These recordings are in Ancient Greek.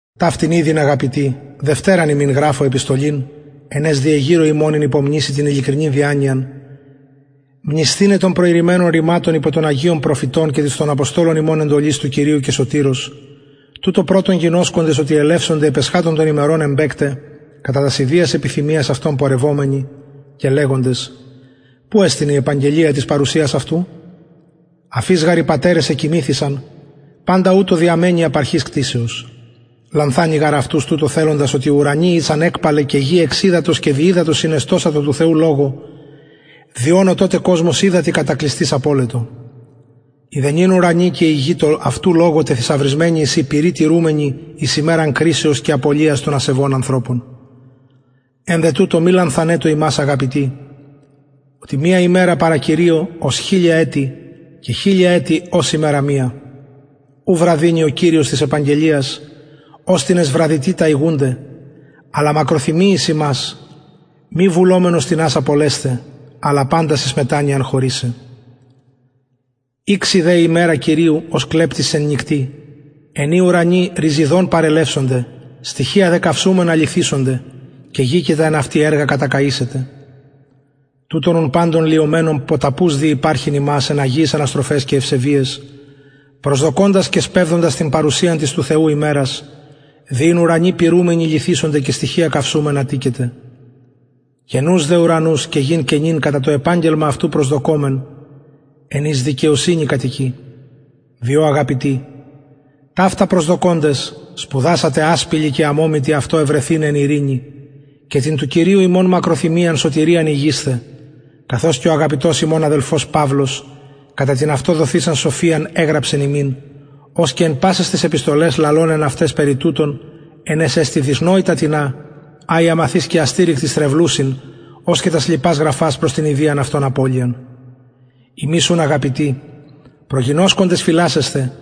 ταυτην ηδη αγαπητοι δευτεραν υμιν γραφω επιστολην εν αις διεγειρω υμων εν υπομνησει την ειλικρινη διανοιαν μνησθηναι των προειρημενων ρηματων υπο των αγιων προφητων και της των αποστολων υμων εντολης του κυριου και σωτηρος τουτο πρωτον γινωσκοντες οτι ελευσονται επ εσχατου των ημερων εμπαικται κατα τας ιδιας επιθυμιας αυτων πορευομενοι και λεγοντες που εστιν η επαγγελια της παρουσιας αυτου αφ ης γαρ οι πατερες εκοιμηθησαν παντα ουτως διαμενει απ αρχης κτισεως λανθανει γαρ αυτους τουτο θελοντας οτι ουρανοι ησαν εκπαλαι και γη εξ υδατος και δι υδατος συνεστωσα τω του θεου λογω δι ων ο τοτε κοσμος υδατι κατακλυσθεις απωλετο οι δε νυν ουρανοι και η γη τω αυτου λογω τεθησαυρισμενοι εισιν πυρι τηρουμενοι εις ημεραν κρισεως και απωλειας των ασεβων ανθρωπων εν δε τουτο μη λανθανετω υμας αγαπητοι οτι μια ημερα παρα κυριω ως χιλια ετη και χιλια ετη ως ημερα μια ου βραδυνει ο κυριος της επαγγελιας ως τινες βραδυτητα ηγουνται αλλα μακροθυμει εις ημας μη βουλομενος τινας απολεσθαι αλλα παντας εις μετανοιαν χωρησαι ηξει δε η ημερα κυριου ως κλεπτης εν νυκτι εν η οι ουρανοι ροιζηδον παρελευσονται στοιχεια δε καυσουμενα λυθησονται και γη και τα εν αυτη εργα κατακαησεται τουτων ουν παντων λυομενων ποταπους δει υπαρχειν υμας εν αγιαις αναστροφαις και ευσεβειαις προσδοκωντας και σπευδοντας την παρουσιαν της του θεου ημερας δι ην ουρανοι πυρουμενοι λυθησονται και στοιχεια καυσουμενα τηκεται καινους δε ουρανους και γην καινην κατα το επαγγελμα αυτου προσδοκωμεν εν οις δικαιοσυνη κατοικει διο αγαπητοι ταυτα προσδοκωντες σπουδασατε ασπιλοι και αμωμητοι αυτω ευρεθηναι εν ειρηνη και την του κυριου ημων μακροθυμιαν σωτηριαν ηγεισθε καθως και ο αγαπητος ημων αδελφος παυλος κατα την αυτω δοθεισαν σοφιαν εγραψεν υμιν ως και εν πασαις ταις επιστολαις λαλων εν αυταις περι τουτων εν οις εστιν δυσνοητα τινα α οι αμαθεις και αστηρικτοι στρεβλουσιν ως και τας λοιπας γραφας προς την ιδιαν αυτων απωλειαν υμεις ουν αγαπητοι προγινωσκοντες φυλασσεσθε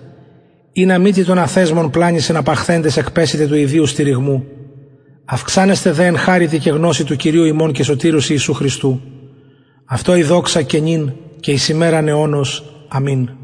ινα μη τη των αθεσμων πλανη συναπαχθεντες εκπεσητε του ιδιου στηριγμου αυξανετε δε εν χαριτι και γνωσει του κυριου ημων και σωτηρος ιησου χριστου αυτω η δοξα και νυν και εις ημεραν αιωνος αμην